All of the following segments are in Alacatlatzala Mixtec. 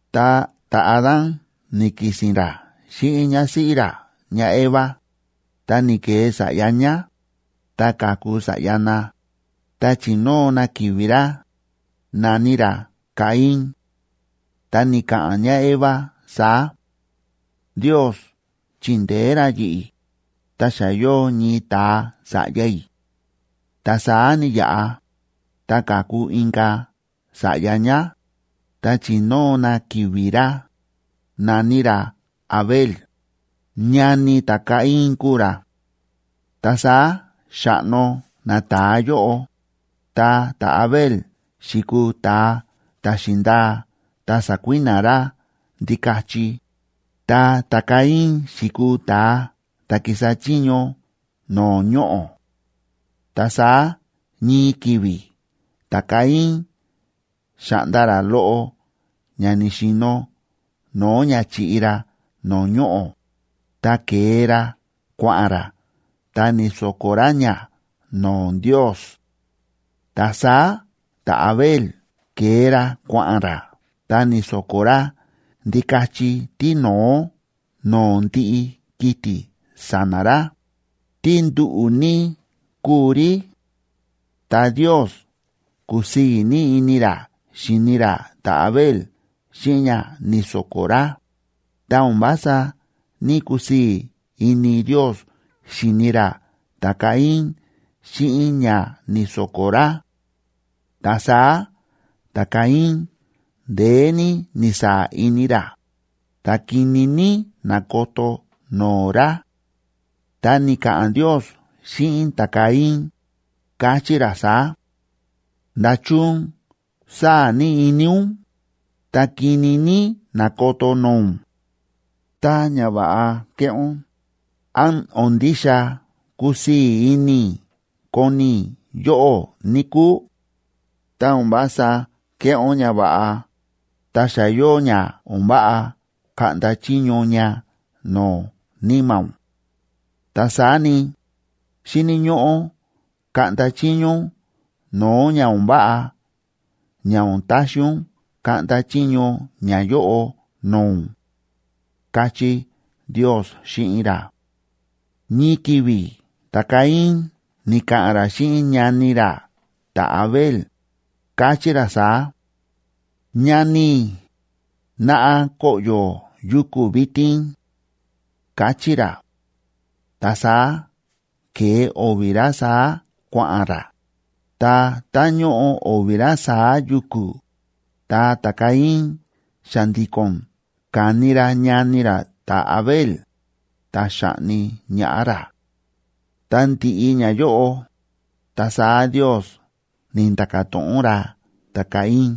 Ta ta̱Adán ni̱ki̱si̱n ra xíꞌin ñásíꞌí ra ñáEva, ta ni̱ke̱e sa̱ꞌya ñá, ta ka̱ku sa̱ꞌya na, ta chi̱nóo na ki̱vi̱ ra, na̱ní ra Caín.a Ta ni̱ka̱ꞌa̱n ñáEva saá: “Ndios chi̱ndeé ra yi̱ꞌi̱, ta xa yóo ñii ta̱a sa̱ꞌya i̱.” Ta saá ni̱yaꞌa, ta ka̱ku inka̱ sa̱ꞌya ñá, ta chi̱nóo na ki̱vi̱ ra, na̱ní ra Abel, ñani ta̱Caín kúu ra. Ta saá xa̱ꞌno nata̱a yóꞌo, ta ta̱Abel xi̱kuu ta̱a ta̱ xi̱ndaa ta sa̱kui̱na̱ ra ndikachi, ta ta̱Caín xi̱kuu ta̱a ta̱ ki̱sa chiño no̱o̱ ñoꞌo̱. Ta saá ñii ki̱vi̱ ta̱Caín xa̱ꞌnda ra loꞌo ña ni̱xi̱no̱ no̱o̱ ña chi̱ꞌi ra no̱o̱ ñoꞌo̱, ta ke̱e ra kua̱ꞌa̱n ra ta ni̱so̱ko̱ ra ña no̱o̱ Ndios. Ta saá ta̱Abel ke̱e ra kua̱ꞌa̱n ra ta ni̱so̱ko̱ ra ndikachi tíno̱ó no̱o̱ ndiꞌi kiti̱ sa̱na̱ ra, tí nduꞌu̱ ní kúu rí. Ta Ndiosb ku̱sii̱ ní ini ra xi̱ni ra ta̱Abel xíꞌin ña ni̱so̱ko̱ ra, ta o̱n vása ní‑kusii̱ ini Ndios xi̱ni ra ta̱Caín xíꞌin ña ni̱so̱ko̱ ra. Ta saá ta̱Caín ndeé ní ni̱saa̱ ini ra, ta kini ní na̱koto no̱o̱ ra. Ta ni̱ka̱ꞌa̱n Ndios xíꞌin ta̱Caín, káchí ra saá: ―¿Nda̱chun sáa̱ ní ini ún, ta kini ní nákoto no̱o̱ ún? Tá ñava̱ꞌa kéꞌé ún, ¿án o̱n ndixa kusii̱ ini i̱ koni i̱ yóꞌó, níkúu? Tá o̱n vása kéꞌé ún ñava̱ꞌa, ta xa yóo ña o̱n váꞌa kaꞌnda chiño ña no̱o̱ níma̱ ún. Ta saá ni, xíni̱ ñóꞌó kaꞌnda chiño ún no̱o̱ ña o̱n váꞌa ña o̱n taxi ún kaꞌnda chiño ñayóꞌo no̱o̱ ún ―káchí Ndios xíꞌin ra. Ñii ki̱vi̱ ta̱Caín ni̱ka̱ꞌa̱n ra xíꞌin ñani ra ta̱Abel, káchí ra saá: ―Ñani i̱, naꞌa koꞌyo̱ yuku̱ vitin ―káchí ra. Ta saá ke̱e o̱vi̱ ra saá kua̱ꞌa̱n ra, ta tá ñóꞌo o̱vi̱ ra saá yuku̱, ta ta̱Caín xa̱ndi̱ko̱n ka̱ni ra ñani ra ta̱Abel, ta xa̱ꞌni ñaꞌá ra. Ta ndi̱ꞌi ñayóꞌo, ta saá Ndios ni̱nda̱ka̱ to̱ꞌon ra ta̱Caín: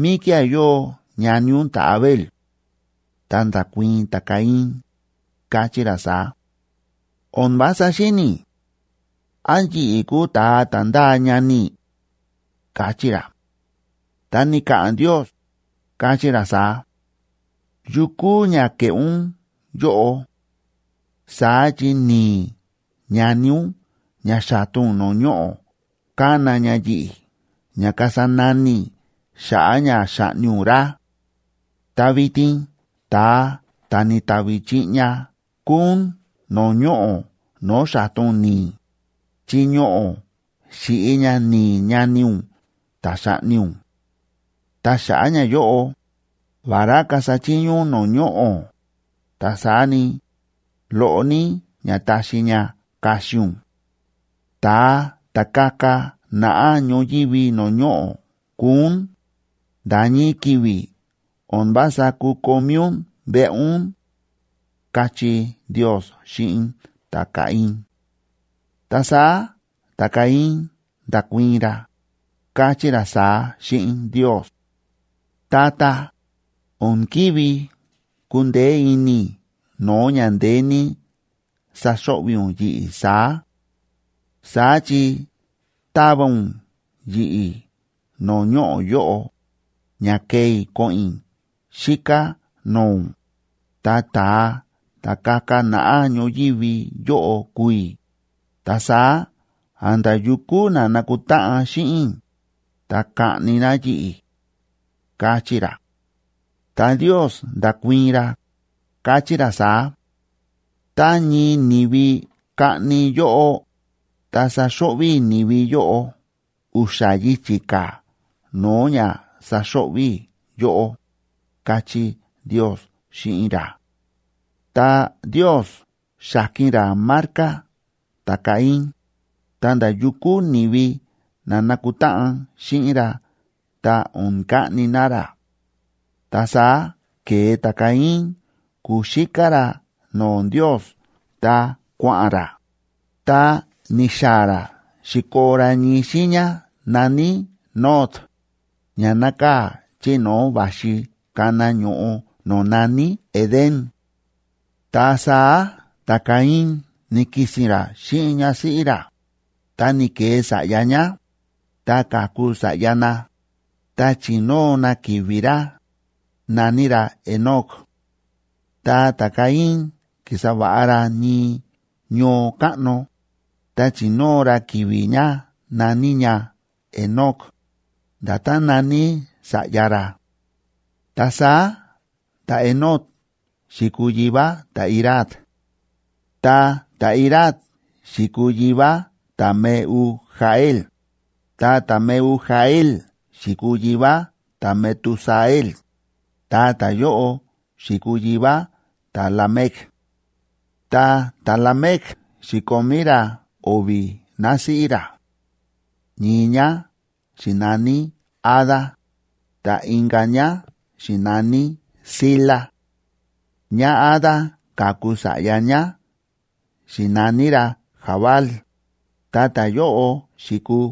―¿Míkía̱ yóo ñani ún ta̱Abel? Ta nda̱kuii̱n ta̱Caín, káchí ra saá: ―O̱n vása xíni̱ i̱. ¿Án yi̱ꞌi̱ kúu ta̱a ta̱ ndáa ñani i̱? ―káchí ra. Ta ni̱ka̱ꞌa̱n Ndios, káchí ra saá: ―¿Yu kúu ña ke̱ꞌé ún yóꞌo? Saá chi ni̱i̱ ñani ún ña xa̱ta ún no̱o̱ ñoꞌo̱ kána ña yi̱ꞌi̱ ña kasa nani i̱ xa̱ꞌa̱ ña xa̱ꞌni ún ra. Ta vitin ta̱a ta̱ ni̱tavi chiꞌña kúu ún no̱o̱ ñoꞌo̱ no̱o̱ xa̱ta ún ni̱i̱, chi ñoꞌo̱ xi̱ꞌi ña ni̱i̱ ñani ún ta̱ xa̱ꞌni ún. Ta xa̱ꞌa̱ ñayóꞌo, vará kasa chiño ún no̱o̱ ñoꞌo̱, ta saá ni, loꞌo ní ña taxi ña kaxi ún. Ta̱a ta̱ kaka naꞌá ñoyívi no̱o̱ ñoꞌo̱ kuu ún, nda̱ ñii ki̱vi̱ o̱n vása kukomí ún veꞌe ún ―káchí Ndios xíꞌin ta̱Caín. Ta saá ta̱Caín nda̱kuii̱n ra, káchí ra saá xíꞌin Ndios: ―Tata, o̱n kívi kundeé ini i̱ no̱o̱ ña ndeé ní saxo̱ꞌvi̱ ún yi̱ꞌi̱ saá. Saá chi táva ún yi̱ꞌi̱ no̱o̱ ñoꞌo̱ yóꞌo, ña kee i̱ ko̱ꞌo̱n i̱ xíká no̱o̱ ún, ta ta̱a ta̱ kaka naꞌá ñoyívi yóꞌo kuu i̱, ta saá a̱nda̱ yu kúu na nakutáꞌan xíꞌin i̱, ta kaꞌni na yi̱ꞌi̱ ―káchí ra. Ta Ndios nda̱kuii̱n ra, káchí ra saá: ―Tá ñii ni̱vi kaꞌni yóꞌó, ta saxo̱ꞌvi̱ i̱ ni̱vi yóꞌo u̱xa̱ yichi̱ ka̱ no̱o̱ ña saxo̱ꞌvi̱ i̱ yóꞌó ―káchí Ndios xíꞌin ra. Ta Ndios xa̱ki̱n ra marca ta̱Caín, ta nda̱ yu kúu ni̱vi na nakutáꞌan xíꞌin ra ta o̱n kaꞌni na ra. Ta saá ke̱e ta̱Caín kuxíká ra no̱o̱ Ndios ta kua̱ꞌa̱n ra, ta ni̱xaa̱ ra xi̱koo ra ñii xiiña na̱ní Nod,c ña nákaa̱ chí no̱o̱ va̱xi kana ño̱ꞌo no̱o̱ na̱ní Edén. Ta saá ta̱Caín ni̱ki̱si̱n ra xíꞌin ñásíꞌí ra, ta ni̱ke̱e sa̱ꞌya ñá, ta ka̱ku sa̱ꞌya na, ta chi̱nóo na ki̱vi̱ ra, na̱ní ra Enoc. Ta ta̱Caín ki̱sa va̱ꞌa ra ñii ñoo káꞌno, ta chi̱nóo ra ki̱vi̱ ña na̱ní ña Enoc, nda̱tán na̱ní sa̱ꞌya ra. Ta saá ta̱Enoc xi̱kuu yivá ta̱Irad. Ta ta̱Irad xi̱kuu yivá ta̱Mehujael, ta ta̱Mehujael xi̱kuu yivá ta̱Metusael, ta ta̱yóꞌo xi̱kuu yivá ta̱Lamec. Ta ta̱Lamec xi̱komí ra o̱vi̱ násíꞌí ra; ñii ñá xi̱naní Ada, ta inka̱ ñá xi̱naní Zila. ÑáAda ka̱ku sa̱ꞌya ñá xi̱naní ra Jabal, ta ta̱yóꞌo xi̱kuu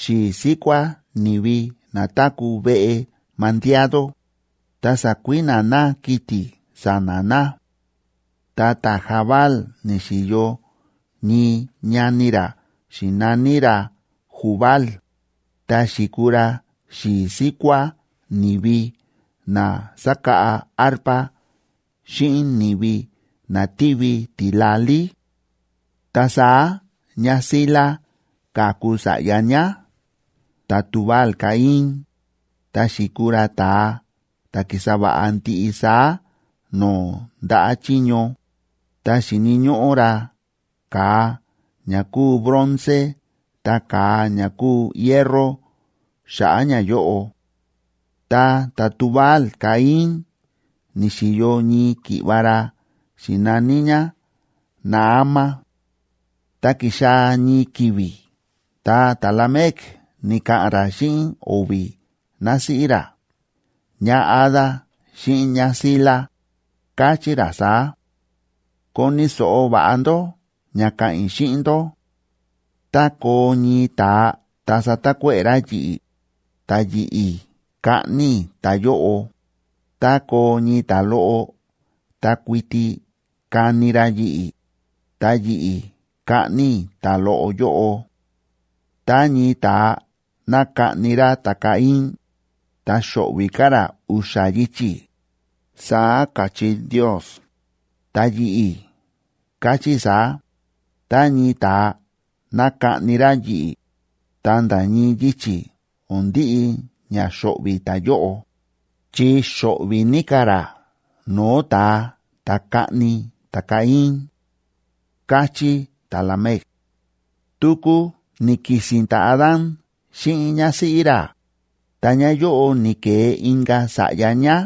xi̱i̱ síkuá ni̱vi na táku̱ veꞌe mandiado, ta sákui̱na̱ na kiti̱ sa̱na̱ na. Ta ta̱Jabal ni̱xi̱yo ñii ñani ra xi̱naní ra Jubal, ta xi̱kuu ra xi̱i̱ síkuá ni̱vi na sákáꞌa arpa xíꞌin ni̱vi na tívi tila̱lí. Ta saá ñáZila ka̱ku sa̱ꞌya ñá ta̱Tubal‑caín, ta xi̱kuu ra ta̱a ta̱ kísa va̱ꞌa ndiꞌi saá no̱o̱ ndaꞌa̱ chiño, ta xíni̱ ñóꞌó ra ka̱a ña kúu bronce ta ka̱a ña kúu hierro xa̱ꞌa̱ ñayóꞌo. Ta ta̱Tubal‑caín ni̱xi̱yo ñii ki̱ꞌva̱ ra xi̱naní ñá Naama. Ta ki̱xaa̱ ñii ki̱vi̱ ta ta̱Lamec ni̱ka̱ꞌa̱n ra xíꞌin o̱vi̱ násíꞌí ra ñáAda xíꞌin ñáZila, káchí ra saá: ¡Koni̱ so̱ꞌo va̱ꞌa ndó ña káꞌa̱n i̱ xíꞌin ndó! Tá koo ñii ta̱a ta satakuéꞌe̱ ra yi̱ꞌi̱, ta yi̱ꞌi̱ kaꞌni i̱ ta̱yóꞌo, tá koo ñii ta̱loꞌo ta kuiti kani ra yi̱ꞌi̱, ta yi̱ꞌi̱ kaꞌni i̱ ta̱loꞌo yóꞌo. “Tá ñii ta̱a ná kaꞌni ra ta̱Caín, ta xo̱ꞌvi̱ ka̱ ra u̱xa̱ yichi̱”, saá ka̱chí Ndios. Ta yi̱ꞌi̱ káchí i̱ saá: Tá ñii ta̱a ná kaꞌni ra yi̱ꞌi̱, ta nda̱ ñii yichi̱ o̱n ndiꞌi ña xo̱ꞌvi̱ ta̱yóꞌo, chi xo̱ꞌvi̱ ní ka̱ ra no̱o̱ ta̱a ta̱ kaꞌni ta̱Caín, káchí ta̱Lamec. Tuku ni̱ki̱si̱n ta̱Adán xíꞌin ñásíꞌí ra, ta ñáyóꞌo ni̱ke̱e inka̱ sa̱ꞌya ñá,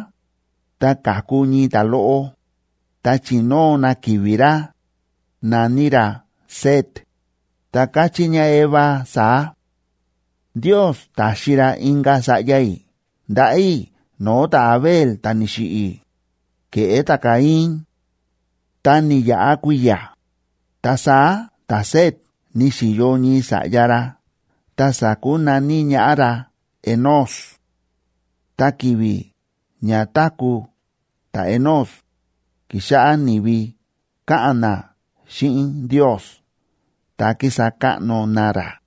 ta ka̱ku ñii ta̱loꞌo, ta chi̱nóo na ki̱vi̱ ra, na̱ní ra Set,d ta káchí ñáEva saá: “Ndios ta̱xi ra inka̱ sa̱ꞌya i̱ ndaꞌa̱ i̱ no̱o̱ ta̱Abel ta̱ ni̱xiꞌi̱, ke̱ꞌé ta̱Caín.” Ta ni̱yaꞌa kui̱ya̱, ta saá ta̱Set ni̱xi̱yo ñii sa̱ꞌya ra ta sa̱kunaní ñaꞌá ra Enós. Ta ki̱vi̱ ña táku̱ ta̱Enós, ki̱xáꞌá ni̱vi káꞌa̱n na xíꞌin Ndios ta kísa káꞌno na ra.